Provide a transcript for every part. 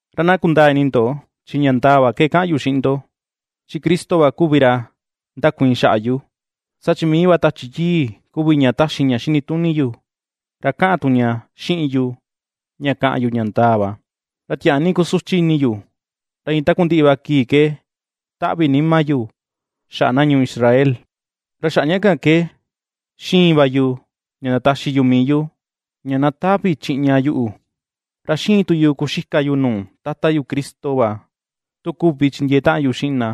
Ra na kundaa ini ndo, chi ña ndaa va ke kaꞌan yu xiꞌin ndo, chi Cristo va kuvi ra ndakuiin xaꞌa yu; saa chi mii va Tachi Yii kuvi ña taxi ña xini tuni yu, ra kaꞌan tu ña xiꞌin yu, ña ^kaꞌan yu ña ndaa va. Ra tiaa ni kusuchi ini yu, ra iin takundiꞌi va kii ke taꞌvi nima yu xaꞌa na ñuu yu Israel, ra xaꞌa ña kan ke ^xiin va yu ña ndataxi yu mii yu, ña na tavi chiꞌña yuꞌu, ra ^xiin tu yu kuxika yu nuu Tata yu Cristo va tu kuvi chindiee taꞌan yu xiꞌin na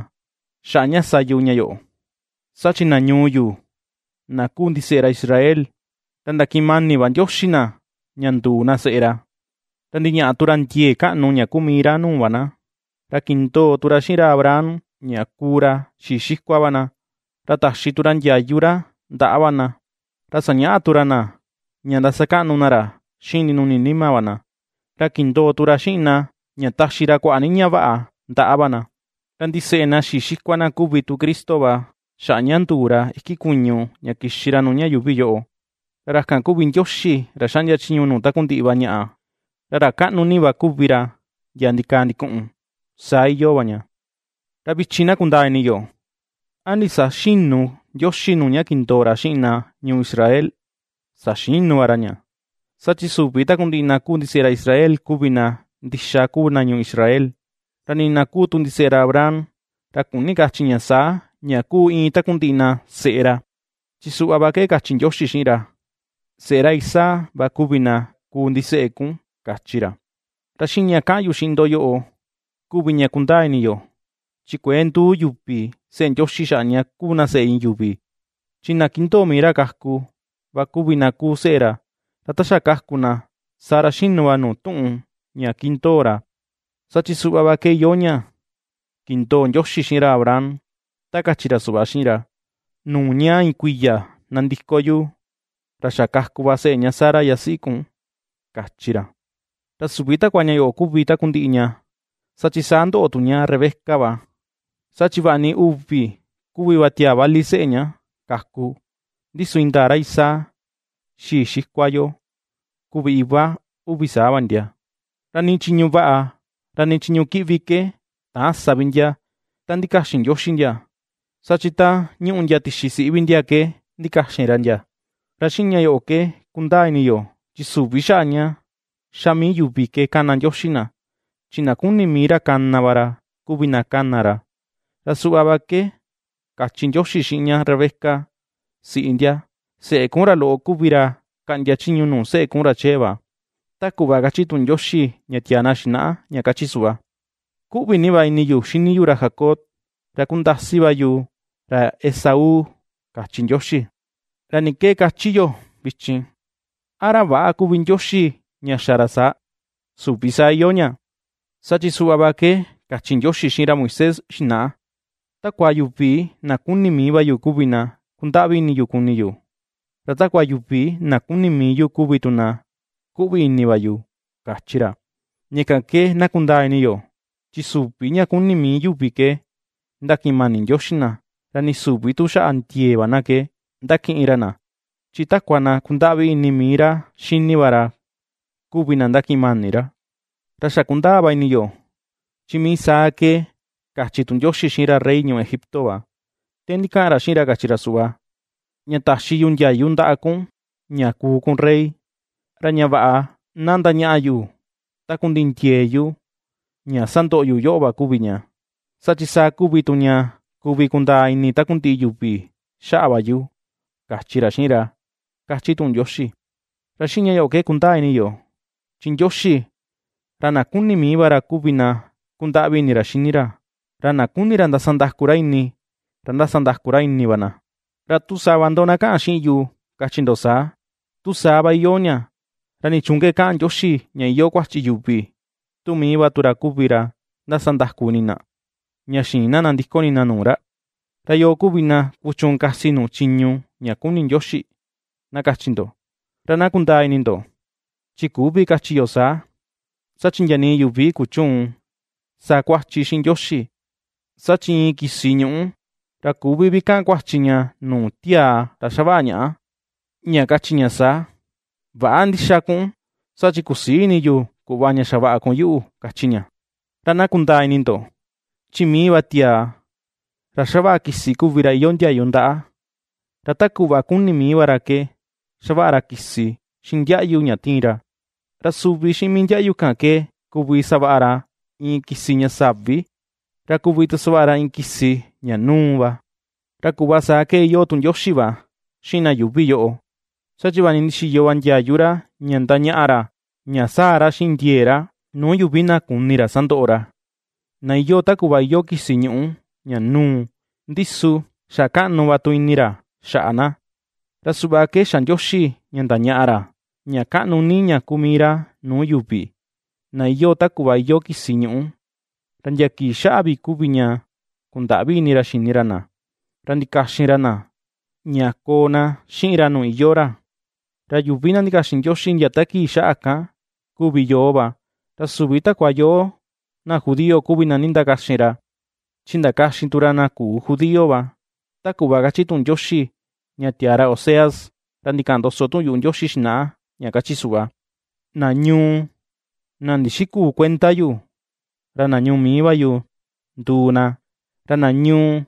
xaꞌa ña sa yu ña yoꞌo. Saa chi na ñuu yu, na kuu ndiseꞌe ra Israel, ra ndakiꞌin mani va Ndioxi na ña nduu na seꞌe ra. Ra ndiñaꞌa tu ra ndiee kaꞌnu ña kuu mii ra nuu va na, ra kindoo tu ra xiꞌin ra Abraham ña kuu ra xii xikua va na, ra taxi tu ra ndiayu ra ndaꞌa va na, ra sañaꞌa tu ra na ña ndasakaꞌnu na ra xiꞌin ndinuni nima va na, ra kindoo tu ra xiꞌin na ña taxi ra kuaꞌa ni ñaꞌa vaꞌa ndaꞌa va na. Ra ndiseꞌe na xii xikua na kuvi tu Cristo va xaꞌa ña nduu ra iki kuñu ña kixi ra nuu ña yuuvi yoꞌo, ra ra kan kuvi Ndioxi ra xaꞌndia chiñu nuu takundiꞌi va ñaꞌa, ra ra kaꞌnu ni va kuvi ra ndia ndikaa ndikuꞌun. Saa iyoo va ña. Ra vichin na kundaa ini yo, ¿a ndisaxïnu Ndioxi nuu ña kindoo ra xiꞌin na ñuu Israel? Saxinu va ra. Saa chi süvi takundiꞌi na kuu ndiseꞌe ra Israel kuvi na ndixa kuu na ñuu Israel. Ra nii na kuu tu ndiseꞌe ra Abraham, ra küni kachi ña saa, ña kuu iin takundiꞌi na seꞌe ra, chi suꞌva va ke kachi Ndioxi xiꞌin ra: “Seꞌe ra Isaac va kuvi na kuu ndiseꞌe kun”, kachi ra. Ra xiꞌin ña kaꞌan yu xiꞌin ndo yoꞌo kuvi ña kundaa ini yo, chi kuëe nduu yuvi seꞌe Ndioxi xaꞌa ña kuu na seꞌe iin yuvi, chi na kindoo mii ra kaku, va kuvi na kuu seꞌe ra, ra ta xa kaku na, saa ra xinu va nuu tuꞌun ña ^kindoo ra. Saa chi suꞌva va ke iyoo ña kindoo Ndioxi xiꞌin ra Abraham, ta kachi ra suꞌva xiꞌin ra: “Nuu ña iin kuiya nandiko yu, ra xa kaku va seꞌe ña Sara yasiꞌi kun”, kachi ra. Ra süvi takua ña yoꞌo kuvi takundiꞌi ña, saa chi saa ndoꞌo tu ña Rebeca va, saa chi vaꞌa ni uvi kuvi va tiaa vali seꞌe ña kaku, ndi su indaa ra Isaac, xii xikua yo, kuvi iva uvi saa va ndia. Ra nii chiñu vaꞌa, ra nii chiñu kiꞌvi ke täan sa vi ndia, ta ndikaxin Ndioxi ndia, saa chi ta ñuꞌù ndia tixi siꞌi vi ndia ke ndikaxin ra ndia, ra xiꞌin ña yoꞌo ke kundaa ini yo, chi süvi xaꞌa ña ^xa mii yuvi ke kana Ndioxi na, chi na kuni mii ra kana va ra, kuvi na kana ra. Ra suꞌva va ke kachi Ndioxi xiꞌin ña Rebeca siꞌi ndia: “Seꞌe kun ra loꞌo kuvi ra, kaꞌndia chiñu nuu seꞌe kun ra chee va.” Ta kuꞌva kachi tuꞌun Ndioxi ña tiaa na xinaꞌa, ña kachi suꞌva: “^Kuꞌvi ni va ini yu xini yu ra Jacob, ra kundasi va yu, ra Esaú”, kachi Ndioxi. ¿Ra ni ke ^kachi yo vichin? ¿A ra väꞌa kuvi Ndioxi ña xa ra saa? ¡Süvi saa iyoo ña! Saa chi suꞌva va ke kachi Ndioxi xiꞌin ra Moisés xinaꞌa: “Takua yuvi na kuni mii va yu kuvi na, kundaꞌvi ini yu kuni yu, ra takua yuvi na kuni mii yu kuvi tu kuꞌvi ini va yu”, kachi ra. Ña kan ke na kundaa ini yo, chi süvi ña kuni mii yuvi ke ^ndakiꞌin mani Ndioxi na, ra nii süvi tu xaꞌa ndiee va na ke ndakiꞌin ra na, chi takua na kundaꞌvi ini mii ra xini va ra, kuvi na ndakiꞌin mani ra. Ra xa kundaa va ini yo, chi mii saa ke kachi tu Ndioxi xiꞌin ra rey ñuu Egipto va, ta ndikaꞌan ra xiꞌin ra kachi ra suꞌva: “Ña taxi yu ndiayu ndaꞌa kun ña kuu kun rey, ra ña vaꞌa na ndañaꞌa yu takundiꞌi ndiee yu ña sandoꞌo yu yoꞌo va kuvi ña, saa chi saa kuvi tu ña kuvi kundaa ini takundiꞌi yuvi xaꞌa va yu”, kachi ra xiꞌin ra, ^kachi tuꞌun Ndioxi. Ra xiꞌin ña yoꞌo ke kundaa ini yo, chi Ndioxi, ra na kuni mii va ra kuvi na kundaꞌvi ini ra xini ra, ra na kuni ra ndasandaku ra ini, ra ^ndasandaku ra ini va na. Ra tu sava tu ndo, na kaꞌan xiꞌin yu, kachi ndo saa: “Tu saa va iyoo ña, ¿ra nichuun ke kaꞌan Ndioxi ña iyoo kuachi yuvi tu mii va tu ra kuvi ra ndasandaku ini na, ña xïin na nandiko ini na nuu ra? ¿Ra yoo kuvi na kuchuun kasi nuu chiñu ña kuni Ndioxi?”, na kachi ndo. Ra na kundaa ini ndo, chi küvi kachi yo saa, saa chi ndia nii yuvi kuchüun ^sakuachi xiꞌin Ndioxi. Saa chi iin kisi ñuꞌú, ra küvi vi kaꞌan kuachi ña nuu tiaa ra xavaꞌa ñaꞌa, ña kachi ña saa: “Väꞌa ndixa kun, saa chi kusïi ini yu kuꞌva ña xavaꞌa kun yuꞌu”, kachi ña. Ra na kundaa ini ndo, chi mii va tiaa ra ^xavaꞌa kisi kuvi ra iyoo ndiayu ndaꞌa, ra ta kuꞌva kuni mii va ra ke xavaꞌa ra kisi xiꞌin ndiaꞌyu ña tiin ra; ra suvi xiꞌin mii ndiaꞌyu kan ke kuvi savaꞌa ra iin kisi ña savi, ra kuvi tu savaꞌa ra iin kisi, ña núu va. Ra kuꞌva saa ke iyoo tu Ndioxi va xiꞌin na yuuvi yoꞌo, saa chi vaꞌa ni ndixiyo va ndiayu ra ña ndañaꞌa ra, ña sáa̱̱ ra xiꞌin ndiee ra, nuu yuvi na kuni ra sandoꞌo ra, na iyoo ta kuꞌva iyoo kisi ñuꞌu ña núu, ndi su ^xa kaꞌnu ni va tu ini ra xaꞌa na. Ra suꞌva ke xa Ndioxi ña ndañaꞌa ra, ña kaꞌnu ni ña kuu mii ra nuu yuvi, na iyoo ta kuꞌva iyoo kisi ñuꞌu, ra ndia kii xaꞌa vi kuvi ña kundaꞌvi ini ra xini ra na, ra ndikaxin ra na, ña koo na xiꞌin ra nuu iyoo ra. Ra yuvi na ndakaxin Ndioxi, ndia ta kii xaꞌa kan kuvi yoo va, ra süvi takua yoo na judío kuvi na nindakaxin ra, chi ndakaxin tu ra na küu judío va. Ta kuꞌva kachi tuꞌun Ndioxi ña tiaa ra Oseas, ra ndikaꞌan ndoso tuꞌun yuꞌu Ndioxi xinaꞌa, ña kachi suꞌva: Na ñuu, na ndixiküu kuenda yu, ra na ñuu mii va yu nduu na, ra na ñuu,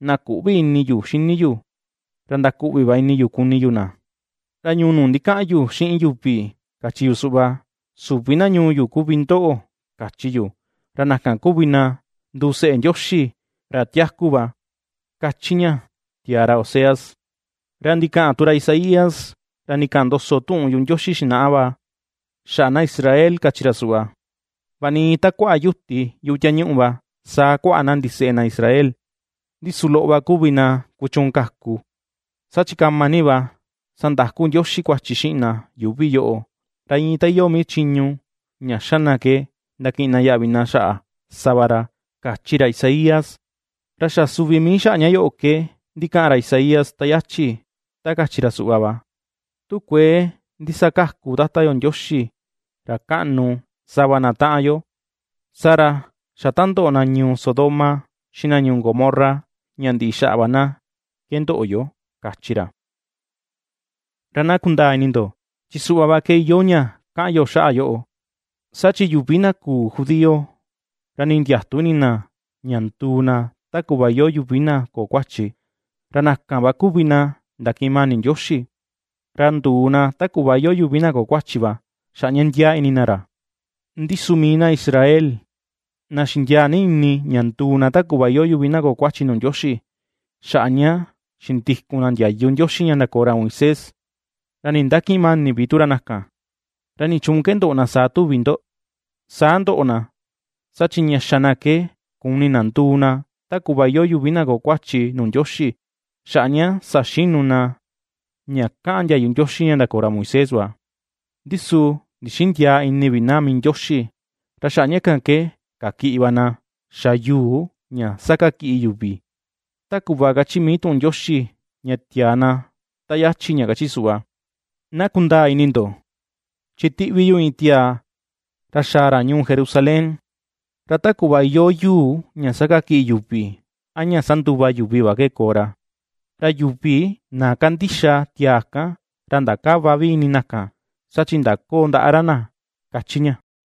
na küꞌvi ini yu xini yu, ra ndakuꞌvi va ini yu kuni yu na. Ra ñuu nuu ndikaꞌan yu xiꞌin yuvi, kachi yu suꞌva: “Süvi na ñuu yu kuvi ndoꞌo”, kachi yu ra na kan kuvi na nduu seꞌe Ndioxi ra tiaku va, ^kachi ña, tiaa ra Oseas. Ra ndikaꞌan tu ra Isaías, ra ndikaꞌan ndoso tuꞌun yuꞌu Ndioxi va xaꞌa na Israel, kachi ra suꞌva: “Vaꞌa ni iin ta kuaꞌa yuti yuꞌu tiañuꞌu va, saa kuaꞌa na ndiseꞌe na Israel, ndi su loꞌo va kuvi na kuchuun kaku. Saa chi kama ni va sandaku Ndioxi kuachi xiꞌin na yuuvi yoꞌo, ra iin ta iyoo mii chiñu ña ^xa na ke ndakiꞌin na yaꞌvi na xaꞌa, sa va ra”, kachi ra Isaías. Ra xa suvi mii xaꞌa ña yoꞌo ke, ndikaꞌan ra Isaías ta yachi, ta kachi ra suꞌva va: Tu kuëe ndisakaku tata yo Ndioxi ra kaꞌnu, sava na taꞌan yo, saa ra xa ta ndoꞌo na ñuu Sodoma, xiꞌin na ñuu Gomorra ña ndiꞌi xaꞌa va na ke ndoꞌo yo, kachi ra. Ra na kundaa ini ndo, chi suꞌva va ke iyoo ña kaꞌan yo xaꞌa yoꞌo, saa chi yuvi na küu judío, ra ni ndiätu ini na, ña nduu na ta kuꞌva iyoo yuvi na köo kuachi, ra na kan va kuvi na ndakiꞌin mani Ndioxi, ra nduu na ta kuꞌva iyoo yuvi na köo kuachi va, xaꞌa ña ndiaa ini na ra. Ndi su mii na Israel, na xindiaa ni ini, ña nduu na ta kuꞌva iyoo yuvi na köo kuachi nuu Ndioxi, xaꞌa ña xindikun na ndiayu Ndioxi ña ndakoo ra Moisés, ra nindakïꞌin mani vi tu ra na kan. ¿Ra nichuun ke ndoꞌo na saa tuvi ndo? Saa ndoꞌo na, saa chi ña xa na ke kuni na nduu na ta kuꞌva iyoo yuvi na köo kuachi nuu Ndioxi xaꞌa ña saxinu na ña kaꞌan ndiayu Ndioxi ña ndakoo ra Moisés va, ndi su ndixïndiaa ini vi na mii Ndioxi. Ra xaꞌa ña kan ke kakiꞌi va na xa “yuu ña ^sakakiꞌi yuvi”. Ta kuꞌva kachi mii tuꞌun Ndioxi ña tiaa na ta yachi, ña ^kachi suꞌva: Na kundaa ini ndo, chi ^tiꞌvi yu iin tiaa, ra xaa ra ñuu Jerusalén, ra ta kuꞌva iyoo yuu ña sakakiꞌi yuvi, a ña sanduva yuvi va ke koo ra, Ra yuvi na kandixa tiaa kan, ra ndakäva vi ini na kan, saa chi ndaköo ndaꞌa ra na, ^kachi ña.